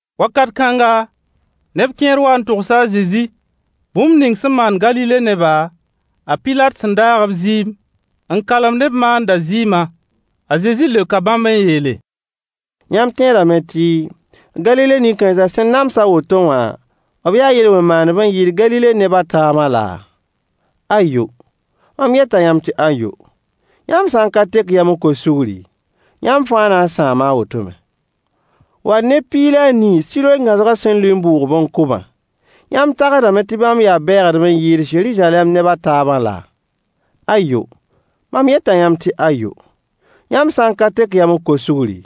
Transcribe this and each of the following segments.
Wakat kãnga, neb kẽer waa n togsa a Zezi bũmb ning sẽn maan Galile neba, a Pilat sẽn daag b zɩɩm n kalem ne b maandã zɩɩmã. A Zezi leoka bãmb n yeele: Yãmb tẽedame tɩ Galile nin-kãens sẽn nams a woto wã, b yaa yel-wẽn maandb n yɩɩd Galile neb a taabã laa? Ayo! Mam yeta yãmb tɩ ayo. Yãmb sã n ka tek yam n kos sugri, yãmb fãa na n sãama a woto me. Wall neb piig la a nii Siloe gãosgã sẽn lʋɩ n bʋʋg-b n kʋ-bã, yãmb tagsdame tɩ bãmb yaa bɛɛgdb n yɩɩd Zeruzalɛm neb a taabã laa? Ayo! Mam yeta yãmb tɩ ayo. Yãmb sã n ka tek yam n kos sugri,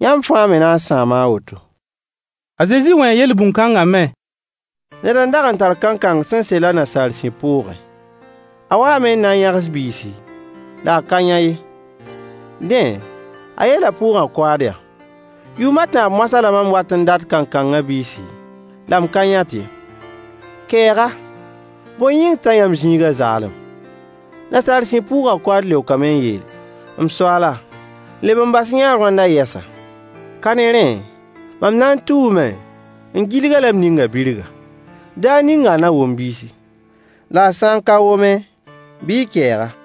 yãmb fãa me na n sãama a woto. A Zezi wẽe yel-bũn kãngã me: Ned n dag n tar kankang sẽn sel a nasaar sib pʋʋgẽ. A waame n na n yãgs biisi, la a ka yã ye. Dẽ, a yeela pʋʋgã koaad yaa: “Yʋʋm a tãab moasã la mam wat n dat kankangã biisi, la m ka yãt ye. Keeg-a! Bõe yĩng t'a yãmb zĩigã zaalem?” Nasaar sib pʋʋgã koaad leokame n yeele: “M soaala, leb n bas-y-yã-a roandã yɛsa. Ka ne rẽ, mam na n tuume n gilg-a la m ning-a birga. Daar ninga a na wom biisi. La a sã n ka wome, bɩ y keeg-a.”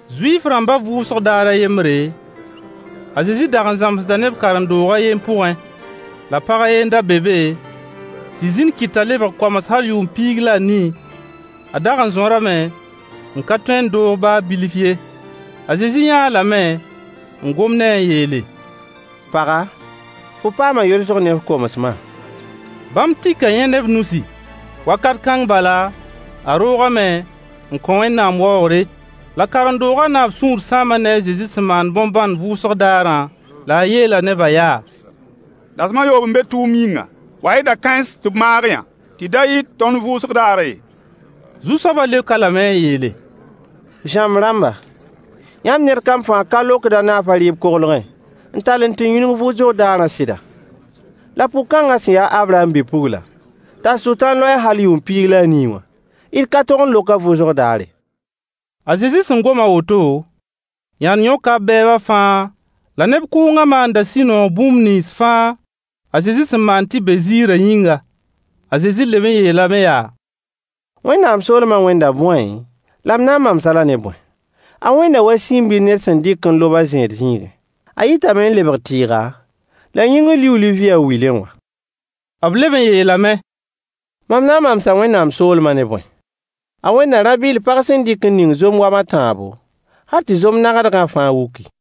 Zuif-rãmbã vʋʋsg daar a yembre, a Zezi dag n zãmsda neb karen-doog a yen pʋgẽ. La pag a yen n da be be, tɩ zĩn kɩt t'a lebg koams hal yʋʋm piig la a nii. A dag n zõrame n ka tõe n doog baa bilf ye. A Zezi yãa-a lame n gom ne-a n yeele: Paga, fo paama yolsg ne f komsmã. Bãmb tika yẽ ne b nusi. Wakat kãng bala, a roogame n kõ Wẽnnaam waoogre. La karen-doogã naab sũur sãama ne a Zezi sẽn maan bõn-bãnd vʋʋsg daarã, la a yeela nebã yaa: Dasem a yoob n be tʋʋm yĩnga. Wa-y da-kãens tɩ b maag-yã, tɩ da yɩt tõnd vʋʋsg daarã ye. Zu-soabã leok-a lame n yeele: Zãmb rãmba, yãmb ned kam fãa ka lokd a naaf a rɩɩb koglgẽ n tall n tɩ yũnug vʋʋsg daarã sɩda? La pʋg kãngã sẽn ya a Abraham bi-pugla, t'a Sʋtãan loe-a hal yʋʋm piig la a nii wã, d ka tog n lok-a vʋʋsg daare? A Zezi sẽn gom a woto, yãnd yõka b bɛɛba fãa, la neb kʋʋngã maanda sũ-noog bũmb nins fãa a Zezi sẽn maan tɩ be ziirã yĩnga. A Zezi leb n yeelame yaa: Wẽnnaam soolma wẽnda bõe, la m na n mams-a-la ne bõe? A wẽnda wa siin-bil ned sẽn dɩk n lob a zẽed zĩigẽ. A yitame n lebg tɩɩga, la yĩngr liuuli vɩɩ a wilẽ wã. B leb n yeelame: Mam na n mamsa Wẽnnaam soolmã ne bõe? A wẽnda rã-bɩll pag sẽn dɩk n ning zom wam a tãabo, hal tɩ zom-nagdgã fãa wuki.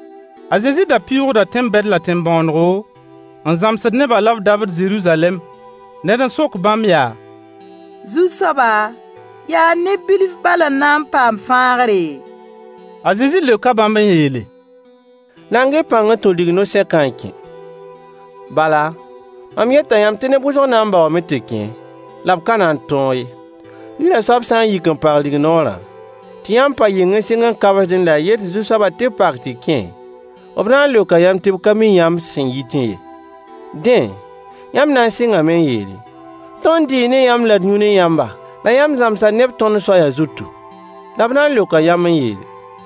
A Zezi da pɩʋʋgda tẽn-bɛd la tẽn-bõonego, n zãmsd nebã la b dabd Zeruzalɛm. Ned n sok bãmb yaa: Zu-soaba, yaa neb bilf bal n na n paam fãagre? A Zezi leoka bãmb n yeele: Nang-y pãng n tũ digno-sẽkã n kẽ. Bala, mam yeta yãmb tɩ neb wʋsg na n baoome tɩ kẽ la b ka na n tõog ye. Yirã soab sã n yik n pag rignoorã, tɩ yãmb pa yɩng n sɩng n kabsdẽ la y yet Zu-soabã tɩ b pak tɩ y kẽ, b na n leoka yãmb tɩ b ka mi yãmb sẽn yitẽ ye. Dẽ, yãmb na n sɩngame n yeele: “Tõnd dɩɩ ne yãmba la d yũ ne yãmba, la yãmb zãmsa neb tõnd soaya zutu.” La b na n leoka yãmb n yeele: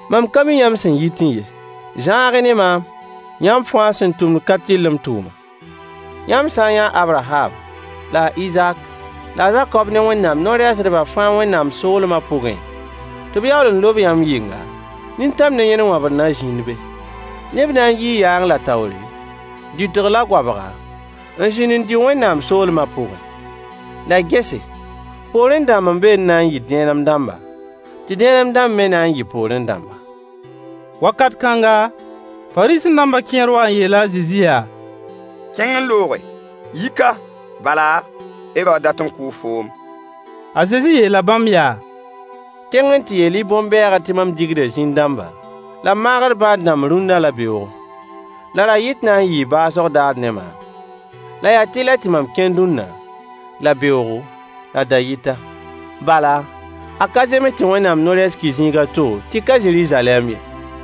“Mam ka mi yãmb sẽn yitẽ ye. Zãag-y ne maam, yãmb fãa sẽn tʋmd ka-tɩrlem tʋʋma.” Yãmb sã n yã a Abraham, la a Izak, la a Zakob ne Wẽnnaam no-rɛɛsdbã fãa Wẽnnaam soolmã pʋgẽ, tɩ b yaool n lob yãmb yɩnga, nintãm ne yẽn wãbr na zĩnd be. Neb na n yii yaang la taoore, dɩtg la goabga, n zĩnd n dɩ Wẽnnaam soolmã pʋgẽ. La gese, poorẽ dãmb n be n na n yɩ dẽenem dãmba, tɩ dẽenem dãmb me yɩ poorẽ dãmba. Wakat kãnga, Fariisẽ-dãmbã kẽer waa n yeela a Zezi yaa: Kẽng n looge! Yi ka, bala, Herood dat n kʋʋ foom. A Zezi yeela bãmb yaa: Kẽng n tɩ yeel-y bõn-bɛɛgã tɩ mam digda zĩn-dãmba, la m maagd bãad-dãmb rũnna la beooge. La ra-yɩt na n yɩɩ baoosg daar ne maam. La yaa tɩlɛ tɩ mam kẽn dũnna, la beoogo, la dayɩta. Bala, a ka zems tɩ Wẽnnaam no-rɛɛs ki zĩig a to tɩ ka Zeruzalɛm ye.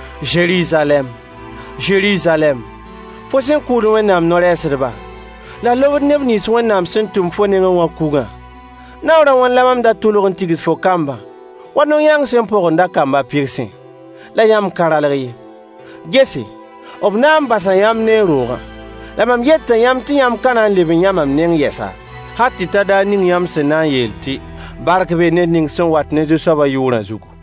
Zeruzalɛm! Zeruzalɛm! Fo sẽn kʋʋd Wẽnnaam no-rɛɛsdba, la f lobd neb nins Wẽnnaam sẽn tʋm fo nengẽ wã kugã, naoor a wãn la mam dag n tʋlg n tigs fo kambã wa no-yãang sẽn põgended a kamb a pɩgsẽ? La yãmb ka ralg ye. Gese, b na n basa yãmb ne y roogã. La mam yeta yãmb tɩ yãmb ka na n leb n yã maam yɛsa, hal tɩ ta daar ning yãmb sẽn na n yeel tɩ: “Bark bee ned ning sẽn wat ne Zu-soabã yʋʋrã zugu.”